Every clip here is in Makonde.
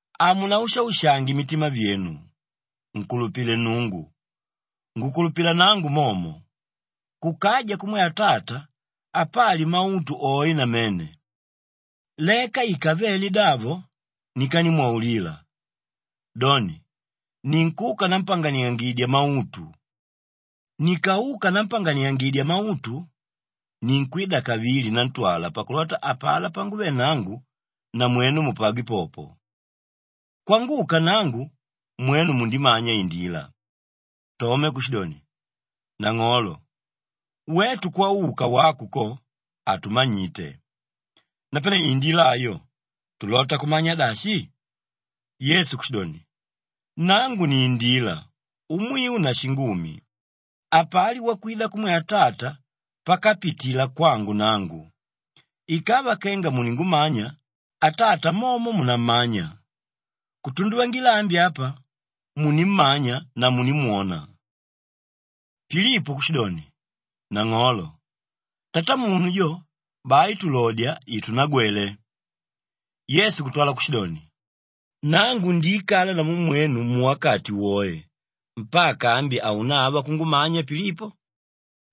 “Hamunaushaushange mitima vyenu. Nkulupile Nnungu; ngukulupila nangu momo. Kukaja kumwe Atata apali mautu oe namene. Leka ikavele davo, nikanimwaulila. Doni, ninkuka nampanganiyangidya mautu. Nikauka nampanganiangidya mautu, ninkwida kavili nantwala pakulota apalá panguve nangu namwenu mupagwe popo. Kwanguka nangu, mwenu mundimanya indila.” Tome kushidoni, “Nang'olo, wetu kwauka wako ko, hatumanyite. Napane indila ayo, tulota kumanya dashi?” Yesu kushidoni, “Nangu ni Indila, Umwiu na Shingumi. Hapali wakwida kumwe Atata pakapitila kwangu nangu. Ikava kenga muningumanya, Atata momo munammanya. Kutunduvangila ambi apa munimmanya na munimwona.” Pilipo kushidoni, “Nang'olo, Tatamunu jo, bai tulodya itunagwele.” Yesu kutwala kushidoni, “Nangu ndiikala namu mwenu muwakati woe, mpaka ambi haunava kungumanya Pilipo?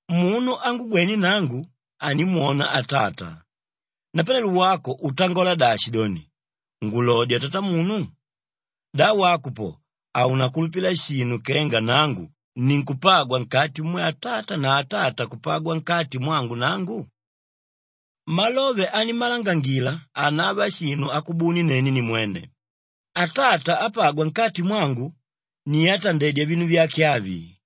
Munu ángugwene nangu, animwona Atata. Napanelo wako utangola dashi doni, ‘Ngulodya Tatamunu’? Da wako po haunakulupila shinu kenga nangu ninkupagwa nkati mumwe Atata na Atata kupagwa nkati mwangu nangu? Malove animmalangangila hanava shinu akubuni nene nimwene; Atata ápagwa nkati mwangu ni átandedya vinu vyake avi.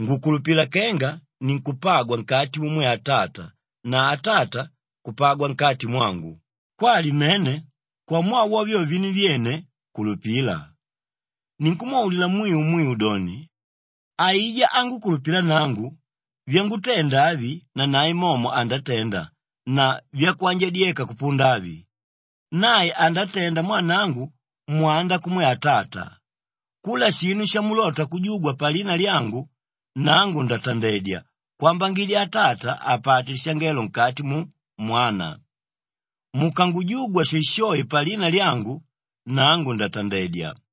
Ngukulupila kenga ninkupagwa nkati mumwe Atata na Atata kupagwa nkati mwangu, kwali mene, kwamwaa wa vyo vinu vyene, kulupila. Ninkumwaulila mwiu mwiu doni, aijá ángukulupila nangu, vyangutenda avi nanae momo andatenda na vyakwanjadyeka kupunda avi, nae andatenda mwaa nangu mwanda kumwe Atata. Kula shinu shamulota kujugwa palina lyangu, nangu ndatandedya kwambangidya Atata apate lishangelo nkati mu Mwana. Mukangujugwa shoeshoe palina lyangu, nangu ndatandedya.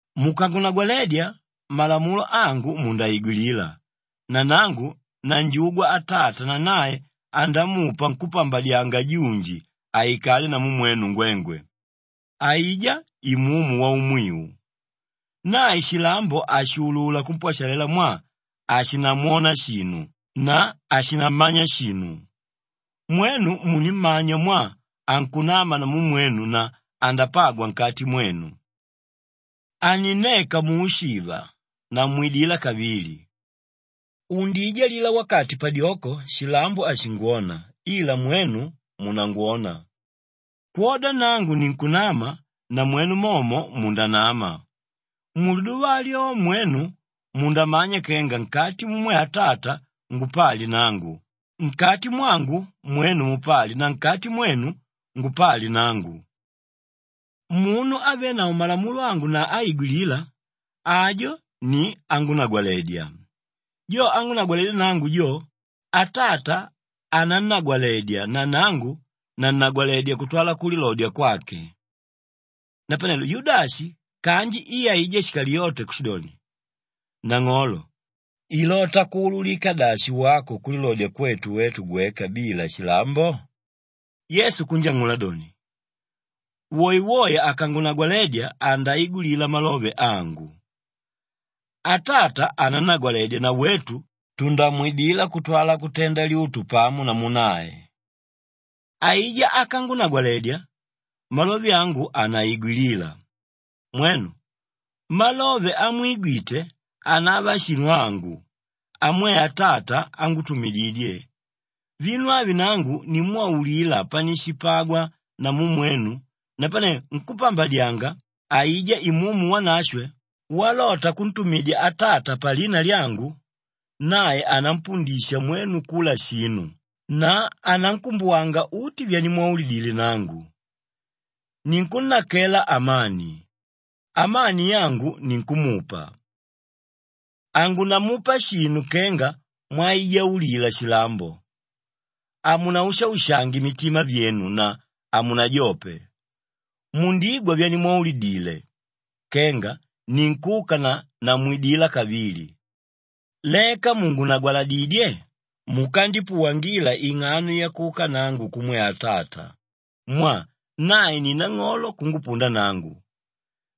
“Mukangunagwaledya, malamulo angu mundaigwilila na nangu nanjugwa Atata na nae andamupa nkúpambadyanga junji aikale namu mwenu ngwengwe, aijá Imumu Waumwiu. Nae shilambo hashuulula kumpwashalela mwaa hashinamwona shinu na hashinammanya shinu. Mwenu munimmanya mwaa ankunama namu mwenu na andapagwa nkati mwenu. Haninneka muushiva, namwidila kavili. Undiijalila wakati padyoko shilambo hashingwona ila mwenu munangwona. Kwoda nangu ninkunama, namwenu momo mundanama. Muliduva alyo mwenu mundamanya kenga nkati mumwe Atata ngupali nangu, nkati mwangu mwenu mupali na nkati mwenu, ngupali nangu. Munu ávenavo malamulo angu na áigwilila, ajo ni ángunagwaledya. Jo ángunagwaledya nangu jo, Atata anannagwaledya na nangu nannagwaledya kutwala kulilodya kwake.” Napanelo Yudashi kanji i aijá Shikaliyote kushidoni, “Nang'olo, ilota kuululika dashi wako kulilodya kwetu wetu gweka bila shilambo?” Yesu kunjang'ula doni, “Woewoe akangunagwaledya andaigwilila malove angu, Atata anannagwaledya na wetu tundamwidila kutwala kutenda lyutu pamo namu nae. Aijá ákangunagwaledya, malove angu hanaigwilila. Mwenu! Malove amwigwite, hanava shinu angu; amwe Atata ángutumididye. “Vinu avi nangu nimwaulila panishipagwa namu mwenu napane nkúpambadyanga, aijá Imumu Wanashwe walota kuntumidya Atata palina lyangu, nae anampundisha mwenu kula shinu na anankumbuwanga uti vyanimwaulidile nangu. Ninkunnakela amani; amani yangu ninkumupa. Hangunamupa shinu kenga mwaijaulila shilambo. Hamunaushaushange mitima vyenu na hamunajope. Mundigwa vyanimwaulidile kenga ninkuka na namwidila kavili. Leka mùngunagwaladidye, mukandipuwangila ing'ano yakuka nangu kumwe Atata mwaa nae ni nang'olo kungupunda nangu.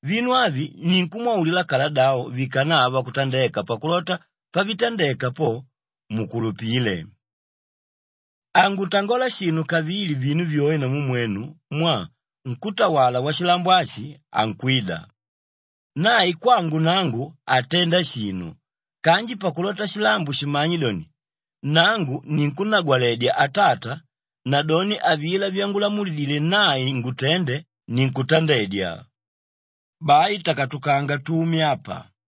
Vinu avi ninkumwaulila kaladavo vikanava kutandeka pakulota pavitandeka po, mukulupile. Hangutangola shinu kavili vinu vyoe namu mwenu mwaa nkútawala washilambo ashi ankwida. Nae kwangu nangu hatenda shinu kanji pakulota shilambo shimanye doni, nangu ninkunnagwaledya Atata, nadoni avilá vyangulamulidile nae ngutende, ninkutandedya. Bai takatukanga, tume apa.